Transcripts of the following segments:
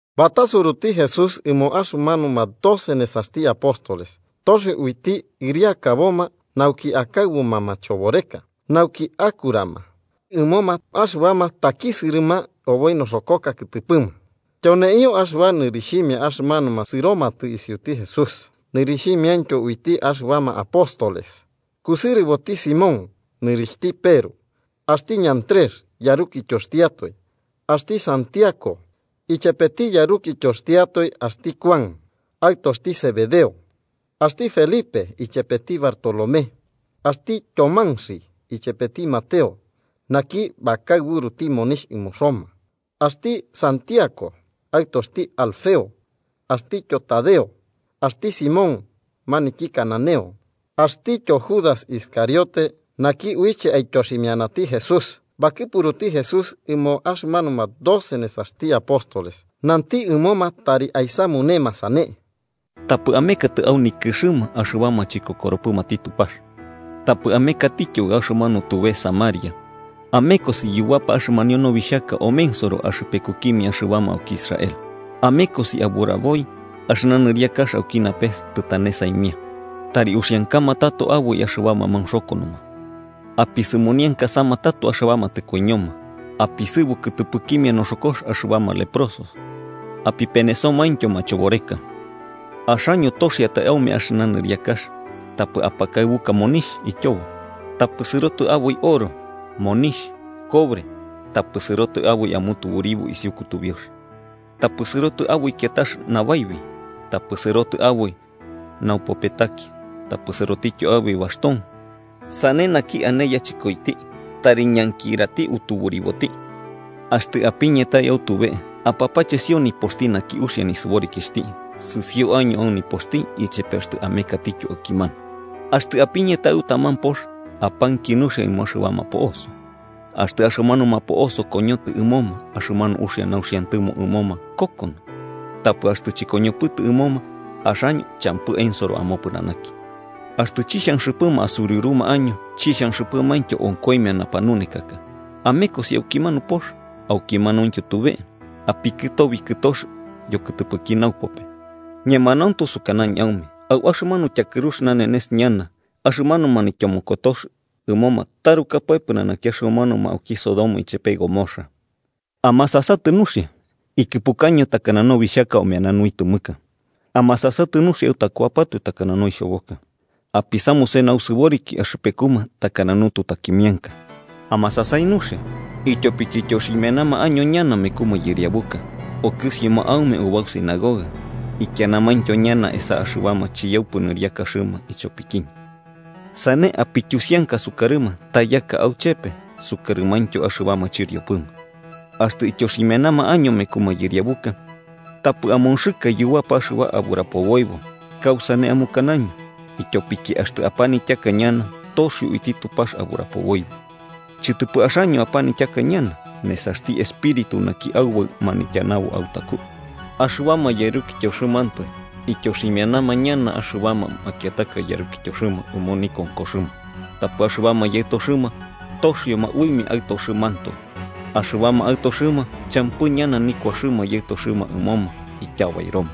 Batasuruti Jesús ɨmo axɨmanuma doce nesaxti apóstoles, toxio uiti ɨriakaboma nauki akaɨbuma machoboreka naukityo bakurarama ɨmoma axɨbama takisɨrɨma oboi noxokoka kɨtɨpɨma. Tyoneio axɨba nɨrixhimia axɨmanuma sɨromatɨ isiuti Jesús nɨrixhimiaintyo uiti axɨbama apóstoles: kusɨrɨboti Simón nɨrixhtityo Peru, axti Ñantrexi yarukityoxtiatoe. Axti Santiago ichepeti yarukityoxtiatoe axti Kuan, aɨtoxti Zebedeo. Axti Felipe, ichepeti Bartolomé, axti Tyomanxi ichepeti Mateo, naki bakaɨburuti monixh ɨmo Roma. Axti Santiago, aɨtoxti Alfeo, axtityo Tadeo. Axti Simón maniki cananeo, axtityo Judas Iscariote, naki uiche aityoximianati Jesús. Bakɨpuruti Jesús ɨmo axɨmanuma doce nesaxti apóstoles nanti ɨmoma tari aisamunema sane: “Tapɨ amekatɨ au nikɨxɨma axɨbama chikokoropɨmati Tupax tapɨ amekatityo au axɨmanu tube Samaria. Amekosi yubapa axɨmanio nobixhaka omensoro axɨpekukimia axɨbama auki Israel. Amekosi aburaboi axɨna nɨriakax auki napes tɨtane saimia. Tari uxiankama tato aboi axɨbama maunxokonoma, apisɨmoniankasama tato axɨbama tɨkoiñoma, apisɨbu kɨtɨpɨkimia noxokox axɨbama leprosos apipenesomaintyo machoboreka. Axaño toxiatai aume axɨna niriakax, tapɨ apakaɨbuka monixh ityobo. Tapɨ sɨrotɨ aboi oro monixh cobre tapɨ sɨrotɨ aboi amutuburibo isiu kutubiux. Tapɨ sɨrotɨ aboi kiatax nabaibi tapɨ sɨrotɨ aboi naupopetaki tapɨ sɨrotityo aboi baxton, sane naki ane yachɨkoiti tari ñankirati tuburiboti. “Axtɨ apiñatai au tube, apapachesio nipoxti naki uxia nisɨborikixhti sɨsio año au nipoxti ichepe axtɨ amekatityo aukimanu. Axtɨ apiñatai au taman pox, apanki nuxia ɨmo axɨbama po'oso. Axtɨ axɨmanuma po'oso koñotɨ ɨmoma, axɨmanu uxia nauxiantɨmo ɨmoma kokono. Tapɨ axtɨ chɨkoñopɨtɨ ɨmoma, axaño champɨ ensorobo amopɨnanaki. Axtɨ chixhanxɨpɨma asuriuruma año chixhanxɨpɨmaintyo onkoimia napanunekaka, amekosi aukimanu pox aukimanauintyo tube apikɨtobi kɨtox yokɨtɨpɨki naupope. Ñemanauntu sukanañɨ aume au axɨmanu tyakɨrux nanenes ñana axɨmanu manaityomokotox ɨmoma tarukapae pɨnanaki axɨmanuma auki Sodoma ichepe Gomorra. “¡Amasasatɨ nuxia! Ikɨpukaño takana nobixhaka omeana nuitɨmɨka. Amasasatɨ nuxia autakuapatoe takana noixhoboka, apisamuse nausɨboriki axɨpekuma takana nututakimianka. Amasasai nuxia, ityopiki ityoximianama año ñana meku mayɨriabuka, okɨsioma aume ubau sinagoga ikianamaintyo ñana esa axɨbama chiyaupɨ nɨriakaxɨma ichopikiñɨ. Sane apityusianka sukarɨma ta yaka auchepe sukarɨmaintyo axɨbama chɨriopɨma. Axtɨ ityoximianama año meku mayɨriabuka, tapɨ amonxɨka yubapa axɨba aburapoboibo, kausane amukanaño, ityopiki axtɨ apanityaka ñana, toxio uiti Tupax aburapoboibo. Chɨtɨpɨ axaño apanityaka ñana, nesaxti Espíritu naki Aubaɨ manityanaboti autaku. “Axɨbama yarukityoxɨmantoe ityoximianama ñana axɨbama makiataka yarukityoxɨma ɨmo nikonkoxɨma, tapɨ axɨbama yaɨtoxɨma toxioma uimia aɨtoxɨmantoe. Axɨbama aɨtoxɨma champɨ ñana nikuaxɨma yaɨtoxɨma ɨmoma ityabairoma.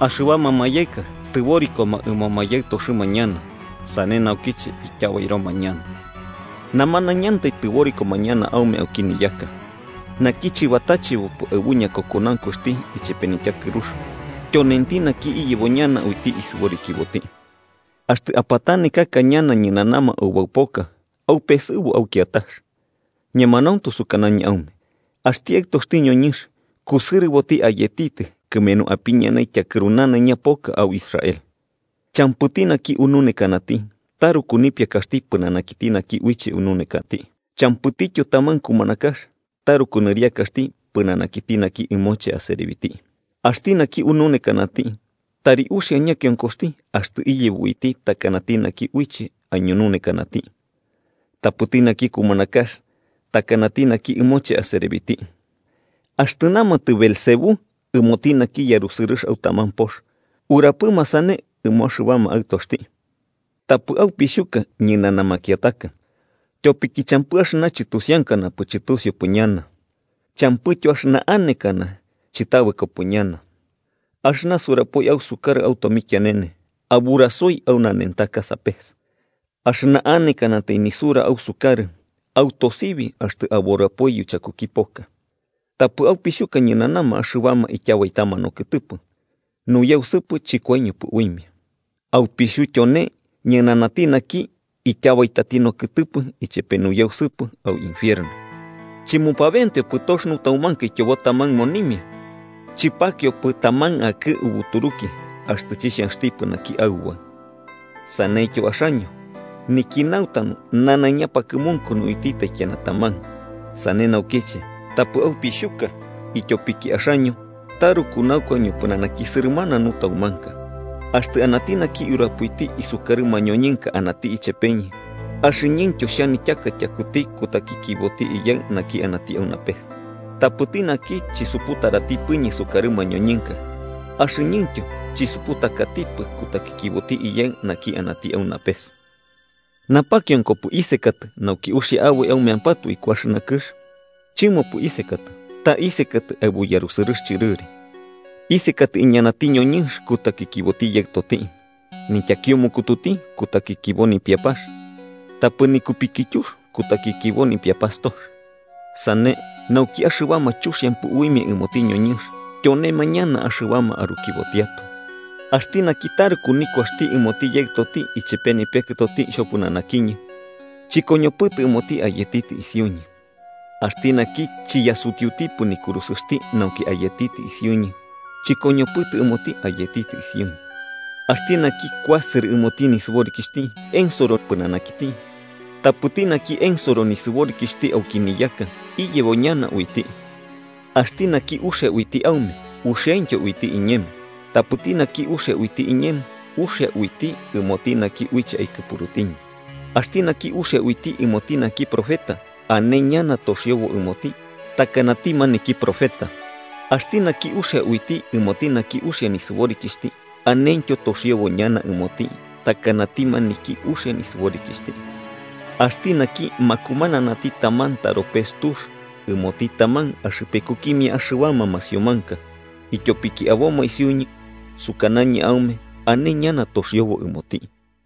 Axɨbama mayaɨka tɨborikoma ɨmoma yaɨtoxɨma ñana sane naukiche ityabairoma ñana. Namanaiñantai tɨborikoma ñana aume auki niyaka. Naki chɨbatachebopɨ aɨbu ñakokonaunkuxti ichepe nityakɨrux, tyonenti naki iyebo ñana uiti isɨborikiboti. Axtɨ apatanekaka ñana ñɨnanama ubau poka, aupesɨbu au kiatax. Ñemanauntu sukanañɨ aume axti Aɨtoxti ñoñɨnx kusɨrɨbo ayetitɨ kɨmenu apiñanai tyakɨru nanaiña poka au Israel. “Champɨti naki ununekanati taruku nipiakaxti pɨnanakiti naki uiche ununekati, champɨtityo taman kumanakax taruku nɨriakaxti pɨnanakiti naki ɨmoche aserebiti. Axti naki ununekanati tari uxia ñakionkoxti axtɨ iyebo uiti takanati naki uiche aiñununekanati, tapɨti naki kumanakax takanati naki ɨmoche aserebiti. Axtɨ namatɨ Beelzebú ɨmoti naki yarusɨrɨx au taman pox, ¿urapɨma sane ɨmo axɨbama aɨtoxti? “Tapɨ, aupixhuka, ñɨnana makiataka. Tyopiki champɨ axɨna chɨtusiankanapɨ chɨtusiupɨ ñana, champɨityo axɨna anekana chɨtabɨkopɨ ñana. Axɨna surapoi ausɨkarɨ au tomikianene, aburasoi au nanentaka sapes. Axɨna anekanatai nisura ausukarɨ, autosibi axtɨ aburapoi yuchakuki poka. Tapɨ aupixhuka ñɨnana axɨbama ityabaitama nokɨtɨpɨ nuyausɨpɨ chɨkoiñopɨ uimia. Aupixhu tyone ñɨnanati naki ityabaitati nokɨtɨpɨ ichepe nuyausɨpɨ au infierno. “¿Chɨmupabenteopɨ tox nutaumanka ityobo taman monimia? Chɨpakiopɨ taman akɨ'ɨ ubuturuki axtɨ chixhanxtipɨ naki Aubaɨ. Saneityo axaño, niki nautanu nanaiña pakɨmunkunu uiti taikiana taman. Sane naukiche tapɨ aupixhuka: ityopiki axaño taruku naukua ñopɨnanaki sɨrɨmana nutaumanka. “Axtɨ anati naki urapoiti isukarɨ mañoñɨnka anati ichepeñɨ, axɨñɨntyo xhanityaka tyakuti kutakikiboti Iyaɨ naki anati au napes. Tapɨti naki chisuputaratipɨñɨ sukarɨ mañoñɨnka, axɨñɨntyo chisuputakatipɨ kutakikiboti Iyaɨ naki anati au napes. “Napakionkopɨ isekatɨ nauki uxia aboi aumeampatoe iku axɨna kɨx. Chɨmopɨ isekatɨ, ta isekatɨ aɨbu yarusɨrɨx chɨrɨri. Isekatɨ iñanati ñoñɨnx kutakikiboti yaɨtoti, nityakiumukututi kutakikibo nipiapax tapɨ nikupikityux kutakikibo nipiapastox. Sane nauki axɨbama chuxiampɨ uimia ɨmoti ñoñɨnx tyonema ñana axɨbama arukibotiatoe. “Axti naki taruku nikuaxti ɨmoti yaɨtoti ichepe nipiakɨtoti xhopɨnanakiñɨ, chɨkoñopɨtɨ ɨmoti ayetitɨ isiuñɨ. Axti naki chiyasutiutipɨ nikurusɨxti nauki ayetitɨ isiuñɨ, chɨkoñopɨtɨ ɨmoti ayetitɨ isiuñɨ. Axti naki kuasɨrɨ ɨmoti nisɨborikixhti, ensoro pɨnanakiti, tapɨti naki ensoro nisɨborikixhti auki niyaka, iyebo ñana uiti. “Axti naki uxia uiti aume, uxiaintyo uiti iñemo. Tapɨti naki uxia uiti iñemo, uxia uiti ɨmoti naki uiche aikɨpurutiñɨ. Axti naki uxia uiti ɨmoti naki profeta, ane ñana toxiobo ɨmoti takanati maniki profeta. Axti naki uxia uiti ɨmoti naki uxia nisɨborikixhti, anentyo toxiobo ñana ɨmoti takanati maniki uxia nisɨborikixhti. Axti naki makumananati taman taropes tux ɨmoti taman axɨpekukimia axɨbama masiomanka ityopiki aboma isiuñɨ, sukanañɨ aume ane ñana toxiobo ɨmoti.”